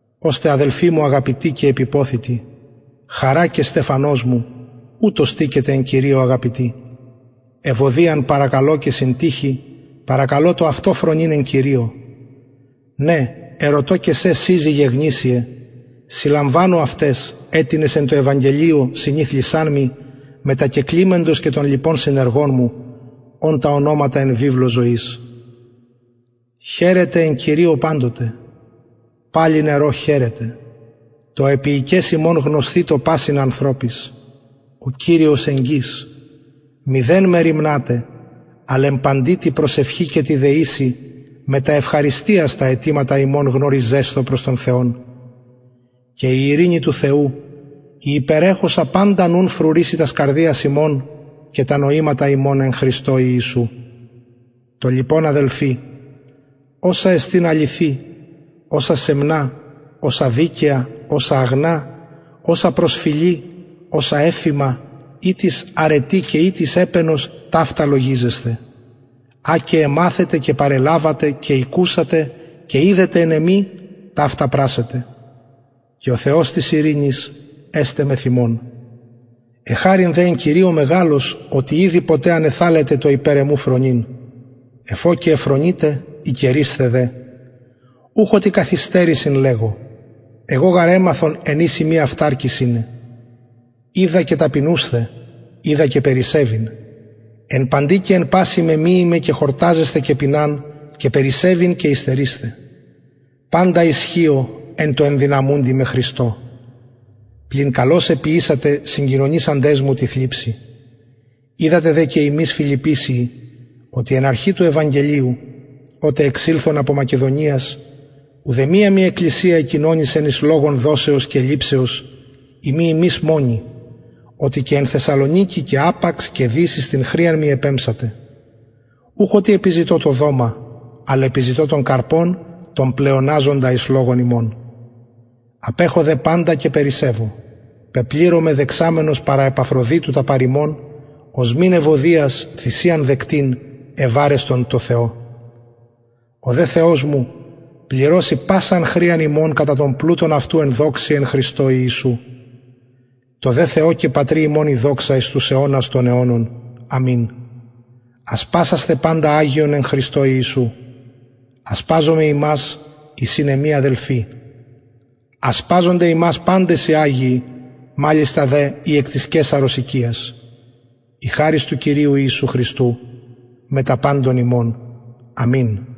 ωστε αδελφοι μου αγαπητοι και επιποθητοι χαρα και στεφανος μου ουτως στηκετε εν κυριω αγαπητοι ευοδιαν παρακαλω και συντυχην παρακαλω το αυτο φρονειν εν κυριω ναι ερωτω και σε συζυγε γνησιε συλλαμβανου αυταις αιτινες εν τω ευαγγελιω συνηθλησαν μοι μετα και κλημεντος και των λοιπων συνεργων μου ων τα ονοματα εν βιβλω ζωης χαιρετε εν κυριω παντοτε παλιν ερω χαιρετε το επιεικες υμων γνωσθητω πασιν ανθρωποις ο κυριος εγγυς μηδεν μεριμνατε αλλ εν παντι τη προσευχη και τη δεησει μετα ευχαριστιας τα αιτηματα υμων γνωριζεσθω προς τον θεον και η ειρηνη του θεου η υπερεχουσα παντα νουν φρουρησει τας καρδιας υμων και τα νοηματα υμων εν χριστω ιησου το λοιπον αδελφοι οσα εστιν αληθη οσα σεμνα οσα δικαια οσα αγνα οσα προσφιλη οσα ευφημα ει τις αρετη και ει τις επαινος ταυτα λογιζεσθε α και εμαθετε και παρελαβετε και ηκουσατε και ειδετε εν εμοι ταυτα πρασσετε και ο θεος της ειρηνης εσται μεθ υμων εχαρην δε εν κυριω μεγαλως οτι ηδη ποτε ανεθαλετε το υπερ εμου φρονειν εφ ω και εφρονειτε ηκαιρεισθε δε ουχ οτι καθ υστερησιν λεγω εγω γαρ εμαθον εν οις ειμι αυταρκης ειναι οιδα και ταπεινουσθαι οιδα και περισσευειν εν παντι και εν πασιν μεμυημαι και χορταζεσθαι και πειναν και περισσευειν και υστερεισθαι παντα ισχυω εν τω ενδυναμουντι με χριστω πλην καλως εποιησατε συγκοινωνησαντες μου τη θλιψει οιδατε δε και υμεις φιλιππησιοι οτι εν αρχη του ευαγγελιου οτε εξηλθον απο μακεδονιας ουδεμια μοι εκκλησια εκοινωνησεν εις λογον δοσεως και ληψεως ει μη υμεις μονοι οτι και εν θεσσαλονικη και απαξ και δις εις την χρειαν μοι επεμψατε ουχ οτι επιζητω το δομα αλλ επιζητω τον καρπον τον πλεοναζοντα εις λογον υμων απεχω δε παντα και περισσευω πεπληρωμαι δεξαμενος παρα επαφροδιτου τα παρ υμων οσμην ευωδιας θυσιαν δεκτην ευαρεστον τω θεω ο δε θεος μου πληρωσει πασαν χρειαν υμων κατα τον πλουτον αυτου εν δοξη εν χριστω ιησου τω δε θεω και πατρι ημων η δοξα εις τους αιωνας των αιωνων αμην ασπασασθε παντα αγιον εν χριστω ιησου ασπαζονται υμας οι συν εμοι αδελφοι ασπαζονται υμας παντες οι αγιοι μαλιστα δε οι εκ της καισαρος οικιας η χαρις του κυριου ιησου χριστου μετα παντων υμων αμην